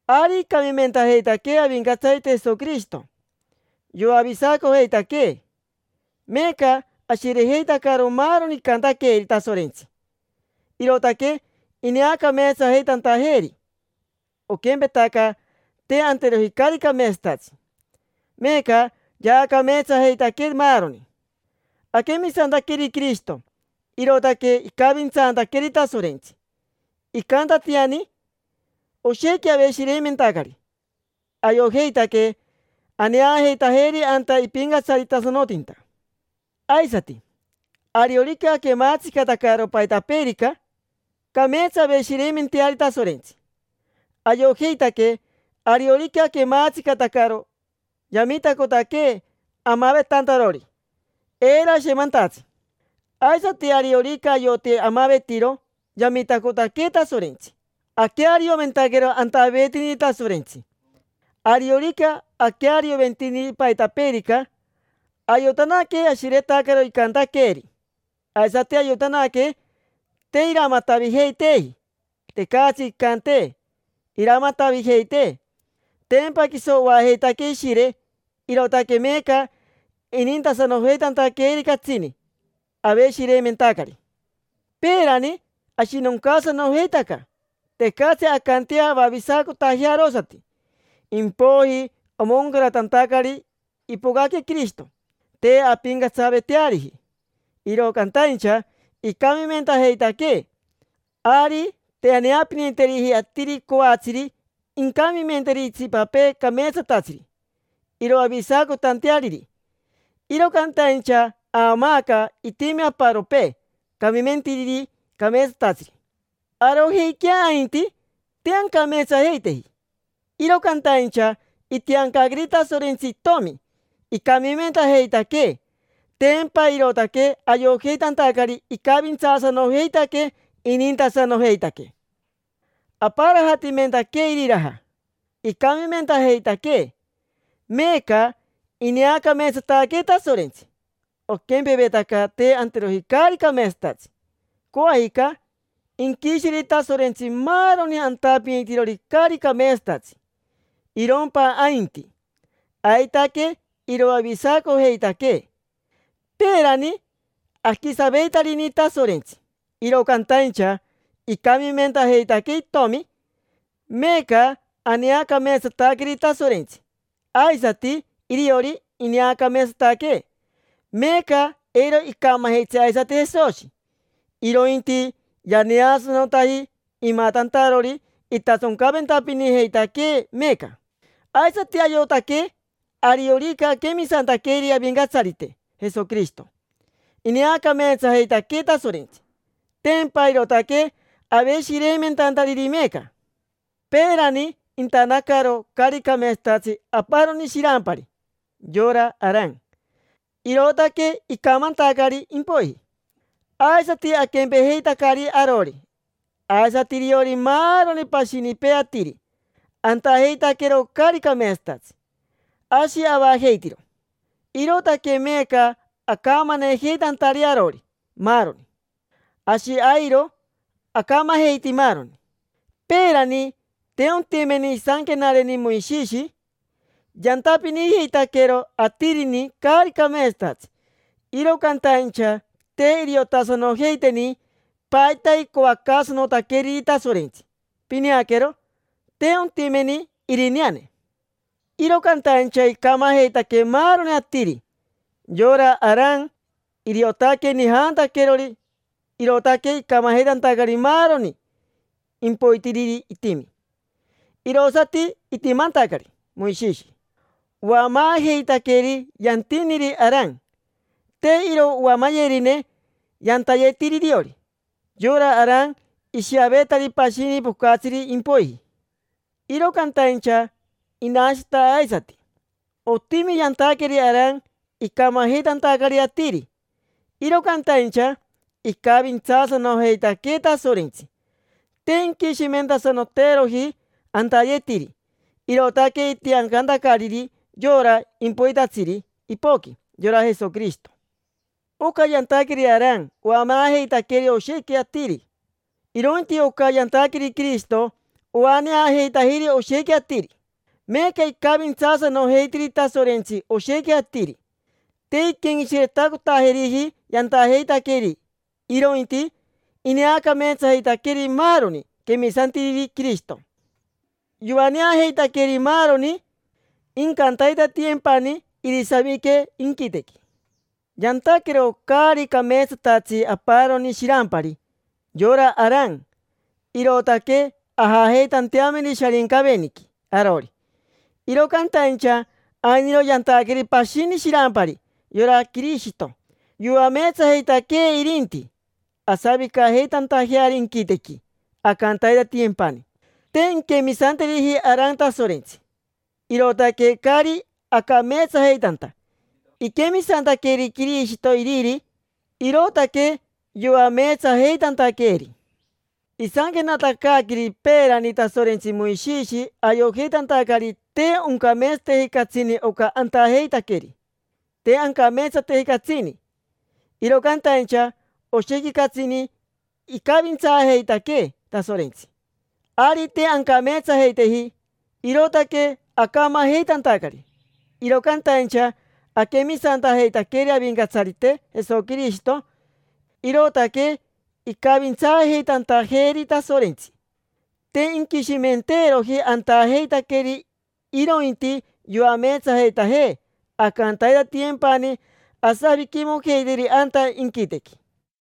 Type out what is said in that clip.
Ari icamimentajeitaquee Avincatsarite Jesoquirishito, yoavisacojeitaquee. Meeca ashirejeitacaro maaroni icantaqueeri Tasorentsi, irootaque ineacameetsajeitantajeeri, oquempetaca te anteroji caari cameetsatatsi; meeca yaacameetsajeitaquee, maaroni. Aquemisantaqueri Quirishito, irootaque icavintsantaqueeri Tasorentsi, icantatiani. Oshequi aveshireimentacari, ayojeitaque aneajeitajeri anta ipincatsaritasanotinta. Aisati, ariorica aquemaatsicatacaro paitapeerica, cameetsa aveshireimenteari Tasorentsi. Ayojeitaque ariorica aquemaatsicatacaro, yamitacotaquee amavetantarori, eiro ashemantatsi. Aisati ariorica ayoti amavetiro, yamitacotaquee Tasorentsi aquearioventaquero antaveetiniri Tasorentsi. Ariorica aquearioventiniri paitapeerica, ayotanaque ashiretacaro icantaqueeri, aisati ayotanaque te iramatavijeiteeji. Tecatsi incantee iramatavijeitee, tempa quiso oajeitaquee Ishire, irootaque meeca inintasanojeitantaqueeri catsini. Aveshireimentacari. Peerani ashinoncaasanojeitaca, tecatsi ancantea avavisacotajea arosati. Impoiji omoncaratantacari, ipocaque Quirishito. Te ampincatsaveteariji, iro cantaincha icamimentajeitaquee. Ari te aneapiniteriji atiri coatsiri incamimenteri itsipapee cameetsatatsiri, iroavisacotanteariri. Iro cantaincha aamaaca itimi aparopee camimentiriri cameetsatatsiri. Arojeiquea ainti, te ancameetsajeiteji, iro cantaincha itiancaqueri Tasorentsi Itomi icamimentajeitaquee. Tempa irootaque ayojeitantacari icavintsaasanojeitaquee, inintasanojeitaquee. Aparajatimentaquee iriraja, icamimentajeitaquee. Meeca ineacameetsataquee Tasorentsi, oquempevetaca te anteroji caari cameetsatatsi. Coajica, inquisheri Tasorentsi maaroni antapinitirori caari cameetsatatsi, irompa ainti, aitaque iroavisacojeitaquee. Peerani aquisaveitarini Tasorentsi, iro cantaincha icamimentajeitaquee Itomi, meeca aneacameetsataqueri Tasorentsi; aisati iriori, ineacameetsataquee. Meeca eiro icamajitsi aisati Jesoshi, irointi yaneasanotaji, imatantarori itasoncaventapinijeitaquee meeca. Aisati ayojeitaque ariorica aquemisantaqueri Avincatsarite Jesoquirishito, ineacameetsajeitaquee Tasorentsi. Tempa irootaque aveshireimentantariri meeca. Peerani intanacaro caari cameetsatatsi aparoni shirampari, yora Aran; irootaque icamantacari impoiji. Aisati aquempejeitacari arori, aisati iriori maaroni pashinipee atiri; antajeitaquero caari cameetsatatsi: ashi avajeitiro. Irootaque meeca acamanejeitantari arori maaroni: ashi airo acamajeiti maaroni. Peerani te ontimeni isanquenareni Moishishi. Yantapinijeitaquero atirini caari cameetsatatsi, iro cantaincha te iriotasanojeiteni paita icoacaasanotaqueriri Tasorentsi: pineaquero, te ontimeni irineane. Iro cantaincha icamajeitaque maaroni atiri: yora Aran, iriotaque nijantaquerori, irootaque icamajeitantacari maaroni impoitiriri itimi, irosati itimantacari Moishishi. Oamaajeitaqueri yantiniri Aran, te iro oamayerine yantayetiri iriori. Yora Aran ishiavetari pashini pocatsiri impoiji, iro cantaincha inashita aisati. Otimi yantaqueri Aran icamajeitantacari atiri. Iro cantaincha icavintsaasanojeitaquee Tasorentsi, te inquishimentasanoteeroji antayetiri, irootaque itiancantacariri yora impoitatsiri ipoqui: yora Jesoquirishito. Oca yantaqueri Aran oamaajeitaqueri oshequi atiri, irointi oca yantaqueri Quirishito oaneajeitajiri oshequi atiri. Meeca icavintsaasanojeitiri Tasorentsi oshequi atiri, te inquenqueshiretacotajeriji yantajeitaqueri, irointi ineacameetsajeitaqueri maaroni quemisantiriri Quirishito. Yoaneajeitaqueri maaroni, incantaitatiyempani irisavique inquitequi. Yantaquero caari cameetsatatsi aparoni shirampari: yora Aran, irootaque ajajeitanteameri Sharincaveniqui arori. Iro cantaincha ainiro yantaqueri pashini shirampari, yora Quirishito. Yoameetsajeitaquee irinti, asavicajeitantajeari inquitequi, ancantaitatiyempani. Te inquemisanteriji Aran Tasorentsi, irootaque caari acameetsajeitanta. Iquemisantaqueri Quirishito iriri, irootaque yoameetsajeitantaqueeri. Isanquenatacaaqueri peerani Tasorentsi Moishishi ayojeitantacari te oncameetsateji catsini oca antajeitaqueri. Te ancameetsateji catsini, iro cantaincha oshequi catsini icavintsaajeitaquee Tasorentsi. Ari te ancameetsajeiteji, irootaque acamajeitantacari, iro cantaincha aquemisantajeitaqueri Avincatsarite Jesoquirishito, irootaque icavintsaajeitantajeeri Tasorentsi. Te inquishimenteeroji antajeitaqueri, irointi yoameetsajeitajee ancantaitatiyempani asaviquimojeitajeri anta inquitequi.